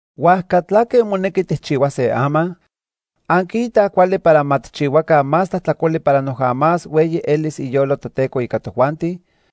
¿Huajca tlaque monequi tijchihuase ama? ¿Anquiitaj cuali para ma tijchihuaca más tlajtlacoli para noja más hueyi elis iyolo Toteco ica tojuanti?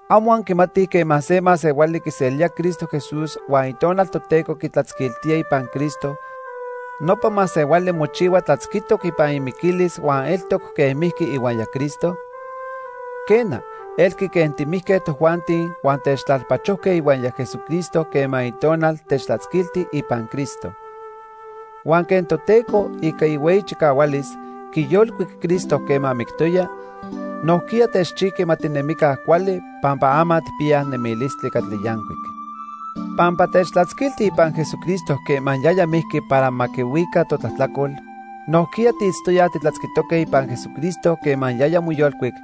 ¿Amo anquimatij quema se masehuali quiselía Cristo Jesús huan Itonal Toteco quitlatzquiltía ipan Cristo, nopa masehuali mochihua tlatzquitoc ipan imiquilis huan eltoc quen mijqui ihuaya Cristo? Quena, elqui quen timijque tojuanti huan techtlalpachojque ihuaya Jesucristo quema Itonal techtlatzquilti ipan Cristo. Huan quen Toteco, ica ihueyi chicahualis, quiyolcuic Cristo quema mictoya, nojquiya techchijqui ma tinemica cuali pampa ama tijpiyaj nemilistli catli yancuic. Pampa techtlatzquiltij ipan Jesucristo quema yaya mijqui para ma quihuica totlajtlacol, nojquiya tiitztoyaj titlatzquitoque ipan Jesucristo quema yaya moyolcuic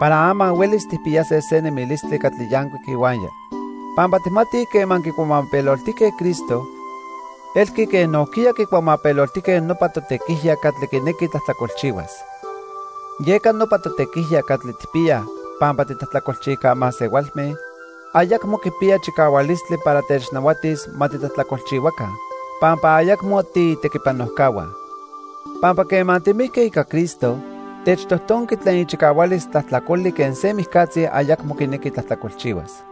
para ama huelis tijpiyase se nemilistli catli yancuic ihuaya. Pampa tijmatij quema quicuamapeloltijque Cristo, elqui quen nojquiya quicuamapeloltijque nopa totequijya catli quinequi tlajtlacolchihuas. Yeca nopa totequijya catli tijpiyaj pampa titlajtlacolchijca masehualme, ayacmo quipiya chicahualistli para technahuatis ma titlajtlacolchihuaca, pampa ayacmo tiitequipanojcahua. Pampa quema timijque ica Cristo, techtojtonqui tlen ichicahualis tlajtlacoli quen se mijcatzi ayacmo quinequi tlajtlacolchihuas.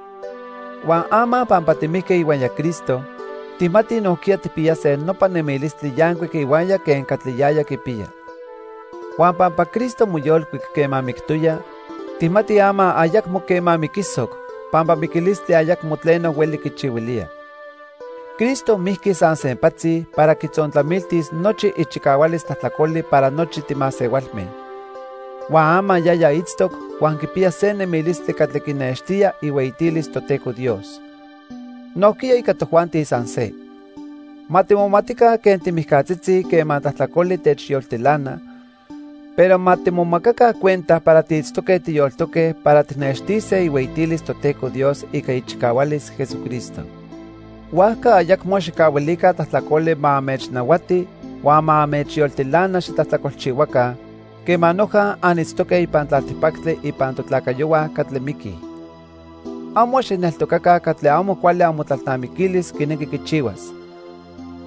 Huan ama pampa timijque ihuaya Cristo, tijmatij nojquiya tijpiyase nopa nemilistli yancuic ihuaya quen catli yaya quipiya. Huan pampa Cristo moyolcuic quema mictoya, tijmatij ama ayacmo quema miquisoc pampa miquilistli ayacmo tleno hueli quichihuilía. Cristo mijqui san sempatzi para quitzontlamiltis nochi ichicahualis tlajtlacoli para nochi timasehualme. Huan ama yaya itztoc huan quipiya se nemilistli catli quinextía ihueyitilis Toteco Dios. Nojquiya ica tojuanti san se. Ma timomatica quen timijcatzitzi quema tlajtlacoli techyoltilana, pero ma timomacaca cuenta para tiitztoque tiyoltoque para tijnextise ihueyitilis Toteco Dios ica ichicahualis Jesucristo. Huajca ayacmo xijcahuilica tlajtlacoli ma anmechnahuati huan ma anmechyoltilana xitlajtlacolchihuaca quema noja anitztoque ipan tlaltipactli ipan totlacayohua catli miquij. Amo xijneltocaca catli amo cuali amotlalnamiquilis quinequi quichihuas.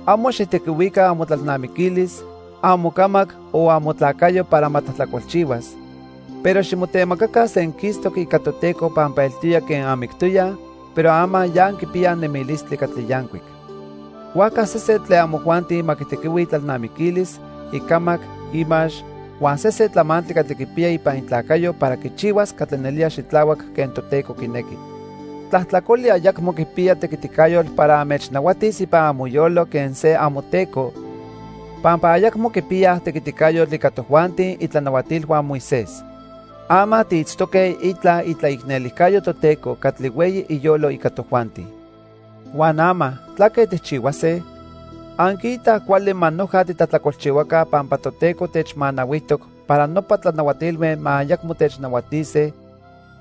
Amo xijtequihuica amotlalnamiquilis, amocamac o amotlacayo para ma tlajtlacolchihuas, pero ximotemacaca senquistoc ica Toteco pampa eltoya quen anmictoyaj, pero ama ya anquipiyaj nemilistli catli yancuic. Huajca sesen tlen amojuanti ma quitequihui itlalnamiquilis, icamac, imax huan sesen tlamantli catli quipiya ipan itlacayo para quichihuas catli nelía xitlahuac quen Toteco quinequi. Tlajtlacoli ayacmo quipiya tequiticayotl para anmechnahuatis ipan amoyolo quen se amoteco, pampa ayacmo quipiyaj tequiticayotl ica tojuanti itlanahuatilhua Moisés. Ama tiitztoque itla itlaicnelijcayo Toteco catli hueyi iyolo ica tojuanti. Huan ama ¿tlaque tijchihuase? ¿Anquiitaj cuali ma noja titlajtlacolchihuaca pampa Toteco techmanahuijtoc para nopa tlanahuatilme ma ayacmo technahuatise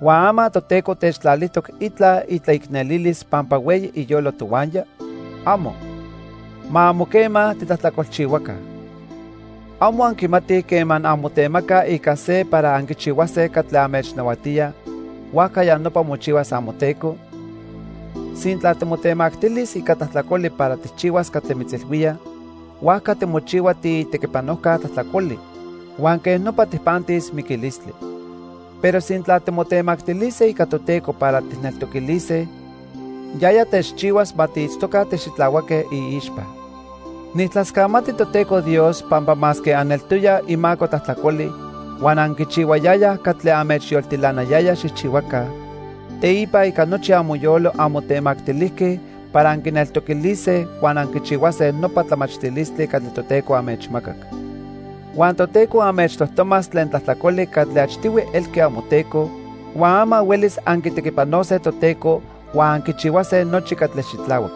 huan ama Toteco techtlalijtoc itla itlaicnelilis pampa hueyi iyolo tohuaya? ¡Amo! Ma amo quema titlajtlacolchihuaca. ¿Amo anquimatij quema anmotemacaj ica se para anquichihuase catli anmechnahuatía, huajca ya nopa mochihuas amoteco? Sintla timotemactilis ica tlajtlacoli para tijchihuas catli mitzilhuía, huajca timochihua tiitequipanojca tlajtlacoli huan quej nopa tijpantis miquilistli. Pero sintla timotemactilise ica Toteco para tijneltoquilise, yaya techchihuas ma tiitztoca tixitlahuaque iixpa. Nijtlascamati Toteco Dios pampa masque aneltoyaj imaco tlajtlacoli huan anquichihuayayaj catli anmechyoltilanayaya xijchihuaca, teipa ica nochi amoyolo anmotemactilijque para anquineltoquilise huan anquichihuase nopa tlamachtilistli catli Toteco anmechmacac. Huan Toteco anmechtojtomas tlen tlajtlacoli catli achtihui elqui amoteco, huan ama huelis anquitequipanose Toteco huan anquichihuase nochi catli xitlahuac.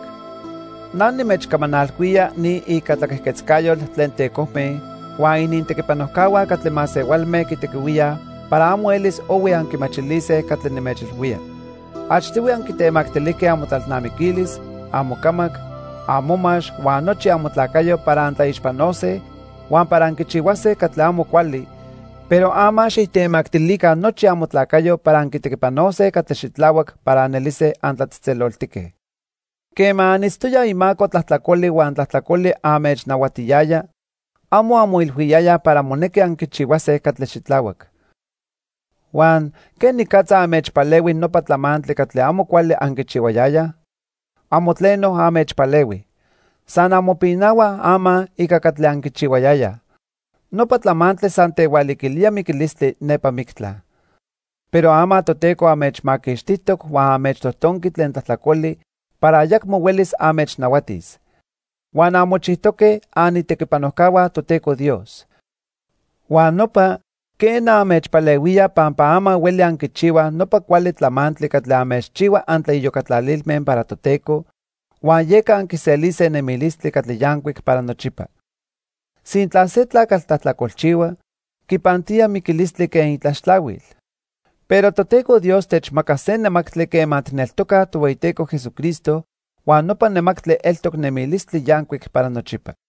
Na nimechcamanalhuía ni ica tlaquejquetzcayotl tlen tecojme huan inintequipanojcahua catli masehualme quitequihuíaj para amo elis ohui anquimachilise catli nimechilhuía. Achtihui anquitemactilijque amotlalnamiquilis, amocamac, amomax huan nochi amotlacayo para antlaixpanose huan para anquichihuase catli amo cuali, pero ama xijtemactilica nochi amotlacayo para anquitequipanose catli xitlahuac para anelise antlatzejtzeloltique. Quema anitztoyaj imaco tlajtlacoli huan tlajtlacoli anmechnahuatiyaya, amo anmoilhuiyayaj para monequi anquichihuase catli xitlahuac. Huan ¿quenicatza anmechpalehui nopa tlamantli catli amo cuali anquichihuayayaj? Amo tleno anmechpalehui. San anmopinahuaj ama ica catli anquichihuayayaj. Nopa tlamantli san tehualiquilía miquilistli nepa mictla. Pero ama Toteco anmechmaquixtijtoc huan anmechtojtonqui tlen tlajtlacoli para ayacmo huelis anmechnahuatis. Huan anmochijtoque anitequipanojcahua Toteco Dios. Huan nopa, quena, anmechpalehuía pampa ama hueli anquichihuaj nopa cuali tlamantli catli anmechchihua antlaiyocatlalilme para Toteco huan yeca anquiselise nemilistli catli yancuic para nochipa. Sintla se tlacatl tlajtlacolchihua, quipantía miquilistli quen itlaxtlahuil, pero Toteco Dios techmaca se nemactli quema tijneltocaj Tohueyiteco Jesucristo, huan nopa nemactli eltoc nemilistli yancuic para nochipa.